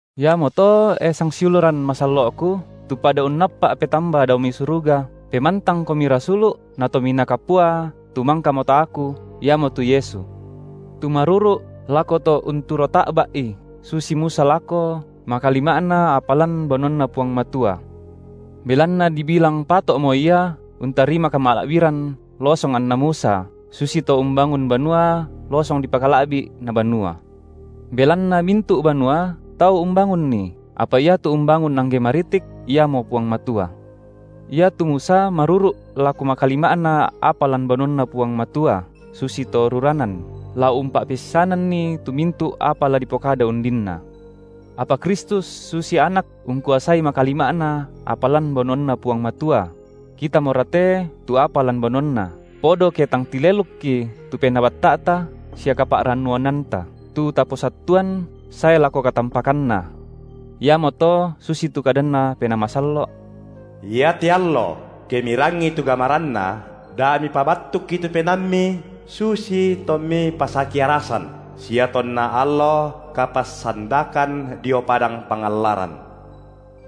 Iamoto e sangsiuluran masallo’ku, tu pada unnappa’ petamba dao mai suruga, pemantangkomi Rasulu’ na Tominaa Kapua tu mangkamo taaku, iamotu Yesu; tu maruru’ lako To unturo ta’bai susi Musa lako (makalima’na) apa lan banuanNa Puang Matua. Belanna dibilang pato’mo Ia untarima kamala’biran losong anna Musa, susito umbangun banua losong dipakala’bi’ na banua. Belanna mintu’ banua tau umbangunni, apa iatu umbangun angge maritik, Iamo Puang Matua. Iatu Musa maruru’ lako makalima’na apa lan banuanNa Puang Matua susi to ruranan, la umpa’peissananni tu mintu’ apa la dipokada undinna, apa Kristus susi Anak ungkuasai makalima’na apa lan banuanNa Puang Matua; kitamorate tu apa lan banuanNa, podo ke tang tilelukki tu penaa batta’ta sia kapa’rannuananta, tu taposattuan (sae lako katampakanna). Iamoto susitu kadanNa Penaa Masallo’: Iate allo, ke mirangii tu gamaranNa, da mipabattukki tu penaammi susi tommi pasaki-arasan, sia tonna allo kapassandakan dio padang pangallaran,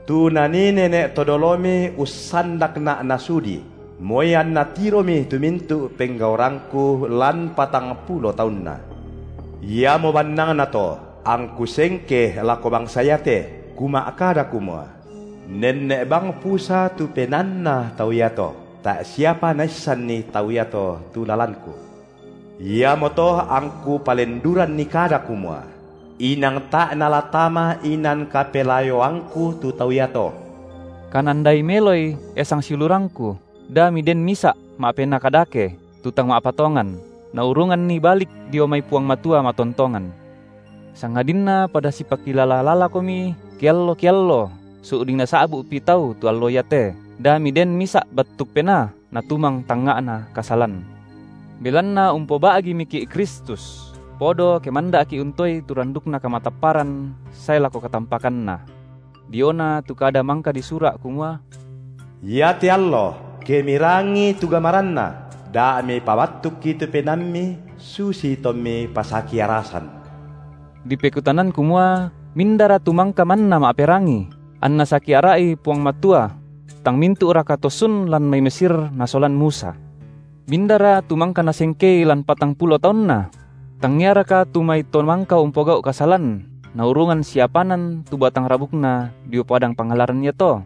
tu nanii nene’ to dolomi usandakNa’ nasudi, moi anna tiromi tu mintu’ penggaurangKu lan patangpulo taunna. Iamo bannangnato angKu sengke lako bangsa iate, Kuma’kada kumua: Nenne’ bang pusa tu penaanna tau iato, tae’ siapa naissanni tau iato tu lalanKu; iamoto angku palenduranni kada kumua: Inang tae’ nala tama inan kapelayoangKu tu tau iato. Kanandai meloi, e sangsiulurangku, da miden misa’ ma’penaa kadake, tu tang ma’patongan, naurunganni balik dio mai Puang Matua matontongan; sangadinna pada sipakilala-lalakomi kiallo-kiallo su’ding nasa’bu’pi tau tu allo iate, da miden misa’ battuk penaa natumang tangnga’na kasalan. Belanna umpoba’gimiki’ Kristus, podo ke manda’ki’ untoei tu randukna kamatapparan sae lako katam- pakanna. Diona tu kada mangka disura’ kumua: Iate allo, ke mirangii tu gamaranNa, da mipabattukki tu penaammi susi tommi pasaki-arasan, dipekutanan kumua: mindara tu mangka manna ma’perangi, anna saki ara’i Puang Matua? Tang mintu’raka to sun lan mai Mesir nasolan Musa? Mindara tu mangka Nasengkei lan patangpulo taunna? Tangiaraka tu mai to mangka umpogau’ kasalan naurungan siapanan tu batang rabukna dio padang pangallaran iato?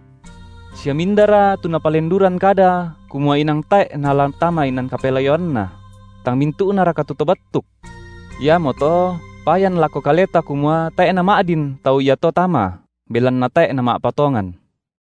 Sia mindara tu Napalenduran kada kumua inang tae’ nala tama inan kapelayoanNa? tang mintu’naraka tu to battuk? Iamoto payan lako kaleta kumua tae’ nama’din tau iato tama, belanna tae’ nama’patongan.